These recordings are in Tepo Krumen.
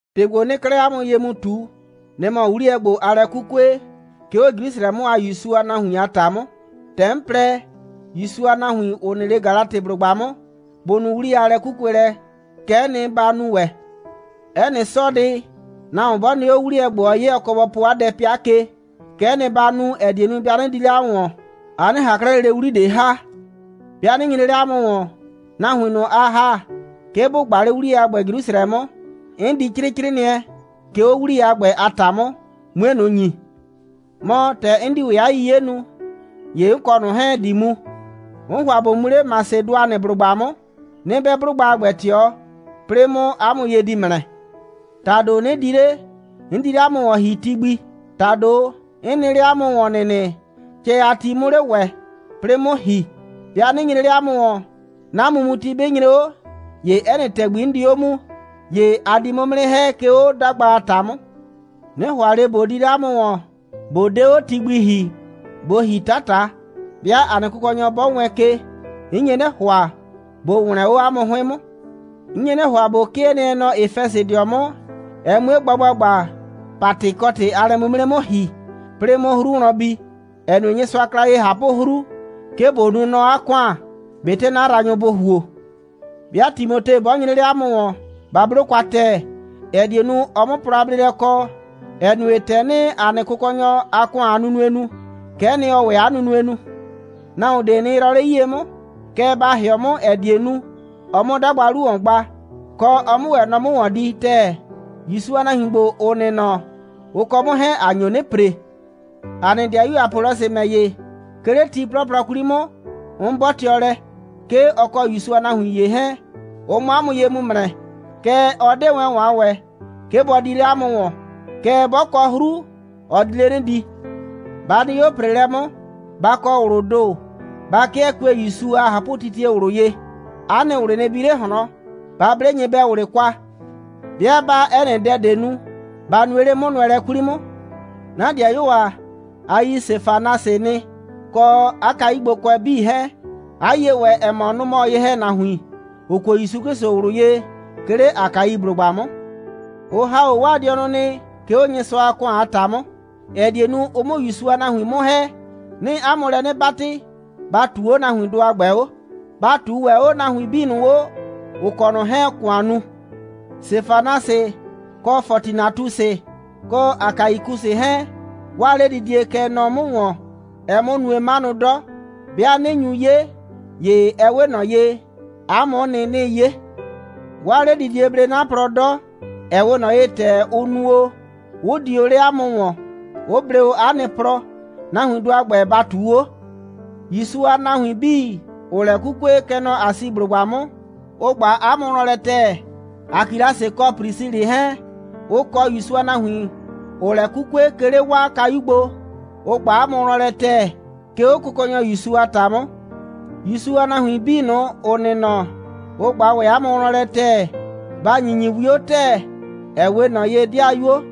‑Tɩ ‑gbo, 'nɩɩ 'klɛɛ 'a mʋ ye mu ꞊tu, nɩ‑ mɔ 'wliyɛ ‑gbo, aa lɛ 'kukue, 'ke 'o Jrusrɛ 'mʋ a ‑Yusu a nahuin a ‑ta 'mʋ. ‑Tɛ 'n plɛ, ‑Yusu a nahuin, ‑ʋ nɩ 'le Galatɩblʋgba 'mʋ, bʋ nu 'wliyɛ a lɛ'kukuelɛ, kɛ'ɛ nɩ, ba nu ‑wɛ. 'Ɛ nɩ 'sɔɔdɩ, nahuon 'bɔ nɩ 'o, 'wliyɛ ‑gbo, ɔɔ 'ye, ɔ kɔ bɔ po 'a dɛ 'pɩa ke. Kɛ'ɛ nɩ ba nu, ‑ɛ die nu, 'nɩ di 'le 'a mʋ ‑wɔn, a 'nɩ ꞊han 'klɛɛ lele 'wli ꞊de ‑ha. 'Bɩa 'nɩ nyre 'le 'a mʋ ‑wɔn, nahuin ꞊nʋ, a ‑ha, 'ke bʋ gba 'le 'wliyɛ a ‑gbɛ Jrusrɛ 'mʋ, 'n di 'crɩɩ 'crɩɩnɩɛ, 'ke 'o 'wliyɛ a ‑gbɛ a ‑ta 'mʋ, 'mue ꞊nʋ ‑nyi. Mɔ, ‑tɛ 'n di ‑wɛ 'a 'yiye nu, ‑ye 'n kɔ ꞊nʋ 'hɛɛn ‑di mu. 'N ‑hʋa ꞊bo mu 'le Masɩdʋanɩblʋgba 'mʋ. 'Nɩ 'bɛ 'blʋgba a ‑gbɛ ꞊tɩɔ, 'plɩɩ 'mʋ 'a mʋ ye di ‑mrɛ. ‑Tado, 'nɩ di 'le, 'n di 'le 'a mʋ ‑wɔn ‑hi ti gbi. ‑Tado 'n nɩ 'le 'a mʋ ‑wɔn ‑nɩnɩ, cɛ a ti 'mʋ 'le ‑wɛ, 'plɩɩ 'mʋ ‑hi. 'Bɩa 'nɩ nyre 'le 'a mʋ ‑wɔn, 'na mumuti 'bɩ nyre 'o, ‑ye 'ɛ nɩ ‑tɛgbi, 'n di 'o mu, ‑ye a di 'mʋ 'mʋ 'nɩ ‑hɛ, 'ke 'o 'dagba a ‑ta 'mʋ. 'Nɩ ‑hʋa ꞊le ꞊bo di 'le 'a mʋ ‑wɔn, ꞊bo 'de 'o ti gbi ‑hi, ꞊bo ‑hi 'tata. 'Bɩa ‑a nɩ Kʋkɔnyɔ 'bɔ wɛɛn ke, 'n nye 'nɩ ‑hʋa, ꞊bo ‑wlɛn 'o 'a mʋ 'hʋɩn 'mʋ. 'N nye 'nɩ ‑hʋa, ꞊bo 'kɩɛ nɩɛ nɔ Efɛsɩdɩɔ 'mʋ, ɛ 'mue gba ‑gbagba, Patɩkɔtɩ a lɛ'mimre 'mʋ ‑hi, 'plɩɩ 'mʋ 'hru wlɔn bi, ‑ɛ nue, Nyɩsʋa kla ye ꞊hapʋ'hru, 'ke ꞊bo nuu nɔ 'a ‑kʋan, ꞊betɩ 'na yraanyʋ bʋ ‑huo. 'Bɩa Timote 'bɔ nyre 'le 'a mʋ ‑wɔn, ba 'blo kwa ‑tɛɛ, ‑ɛ die nu, ɔ 'mʋ plɔ a bleelɛ kɔ, ‑ɛ nue, ‑tɛ 'nɩɩ ‑a nɩ Kʋkɔnyɔ a ‑kʋan a nunue nu, kɛ'ɛ nɩ, ɔɔ ‑wɛ 'a nunue nu. Nahuon ꞊de nɩ yrɔɔ 'le 'yie 'mʋ. Kɛɛ, ba ‑hɩɔ 'mʋ, ‑ɛ die nu, ɔ 'mʋ 'a 'dagba 'lu ‑wɔn gba, kɔ, ɔ 'mʋ ‑wɛ nɔ 'mʋ ‑wɔn di ‑tɛɛ. ‑Yusu a nahuin ‑gbo, ‑ʋ nɩ nɔ, ʋ kɔ 'mʋ 'hɛɛn, ‑a nyo 'nɩ ‑pre. ‑A nɩ 'dɩayu Apɔlɔsɩ ‑mɛ ‑ye, 'ke 'le ti 'plɔplɔ 'kwli 'mʋ, 'n 'bɔtɩɔ lɛ, 'ke ɔ kɔ ‑Yusu a nahuin ‑ye 'hɛɛn, ʋ 'mʋ 'a mʋ ye mu ‑mrɛ. Kɛɛ, ɔ 'de wɛn ‑wɔn a ‑wɛɛ, 'ke bɔ di 'le 'a mʋ ‑wɔn. Kɛɛ, 'bɔ kɔ 'hru, ɔ di 'le 'nɩ di. Ba nɩ 'o ‑preelɛ 'mʋ. Ba kɔ ꞊wlʋʋ ‑do, ba 'kɩɛ kue ‑Yusu a ꞊hapʋtitie ꞊wlʋ ye. 'A nɩ ꞊wlɩ nɩ bi 'le ꞊hlɔn. Ba 'ble nyɩbɛ꞊wlɩ kwa. 'Bɩa 'baa 'ɛ nɩ dɛ ꞊de nu, ba nue 'le 'mʋnʋɛlɛ 'kwli 'mʋ. 'Na 'dɩayuo ‑a, a yi Sefanasɩ nɩ, kɔ 'a kayugbokʋɛ 'bii 'hɛɛn, 'a yie ‑wɛ, ‑ɛ mɔ, nʋ‑ mɔ ye‑hɛnahuin, ‑ʋ kuo ‑Yusu 'Klɩsʋ ꞊wlʋ ye, 'ke 'le Akaiblʋgba 'mʋ. Ʋ ‑ha 'o 'waa dɩɔnʋ nɩ, 'ke 'o Nyɩsʋa a ‑kʋan a ‑ta 'mʋ, ‑ɛ die nu, ʋ 'mʋ ‑Yusu a nahuin 'mʋ ‑hɛ. 'Nɩɩ 'a mʋ lɛ 'nɩ 'batɩ, ba ꞊tuu 'o nahuindʋ a ‑gbɛ 'o. Ba ꞊tuu ‑wɛ 'o nahuin 'bii ꞊nʋ, ‑ʋ kɔ ꞊nɔ 'hɛɛn‑ ‑kʋan nu. Sefanasɩ, kɔ Fɔtinatusɩ, kɔ Akaikusɩ 'hɛɛn, 'waa 'ledidie kɛ nɔ 'mʋ ‑wɔn, ɛɛ 'mʋ nue 'manʋ 'dɔ. 'Bɩa 'nɩ nyu 'ye, ‑ye ɛ 'we ꞊nɔ ye, 'a mʋ'ʋ nɩ, 'nɩɩ 'ye. 'Waa 'ledidie blee 'na plɔ 'dɔ, ‑ɛ 'we ꞊nɔ ye, ‑tɛ ʋ nu o, 'ʋ di o 'le 'a mʋ ‑wɔn, 'ʋ blee o 'a nɩ plɔ. Nahuindʋ a ‑gbɛ, ba ꞊tuu 'o. ‑Yusu a nahuin 'bii, ‑ʋʋ lɛ 'kukue, kɛ nɔ Asiblʋgba 'mʋ, ʋ ꞊gba 'a mʋ wlɔn lɛ ‑tɛɛ. Akilasɩ kɔ Prisilɩ 'hɛɛn, ʋ kɔ ‑Yusu a nahuin, ‑ʋʋ lɛ 'kukue, 'ke 'le 'waa kayu gbo, ʋ ꞊gba 'a mʋ wlɔn lɛ ‑tɛɛ, 'ke 'o Kʋkɔnyɔ ‑Yusu a ‑ta 'mʋ. ‑Yusu a nahuin 'bii ꞊nʋ, ‑ʋ nɩ nɔ, ʋ ꞊gba ‑wɛ 'a mʋ wlɔn lɛ ‑tɛɛ. Ba ‑nyinyi 'wio ‑tɛɛ, ‑ɛ 'we ꞊nɔ ye ‑dɩayuo.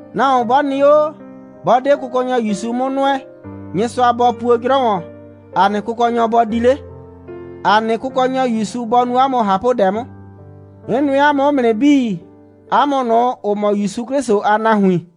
Nahuon 'bɔ nɩ 'o, 'bɔ 'de Kʋkɔnyɔ ‑Yusu 'mʋ nʋɛ, Nyɩsʋa bɔ puo 'jrɔ ‑wɔn! ‑A nɩ Kʋkɔnyɔ, bɔ di 'le! ‑A nɩ Kʋkɔnyɔ ‑Yusu bɔ nu 'a mʋ ꞊hapʋdɛ 'mʋ. 'N nʋɛ 'a mʋ 'mʋ nɩ 'bii, 'a mʋ ꞊nʋ, ‑ʋ mɔ ‑Yusu 'Klɩsʋ a nahuin.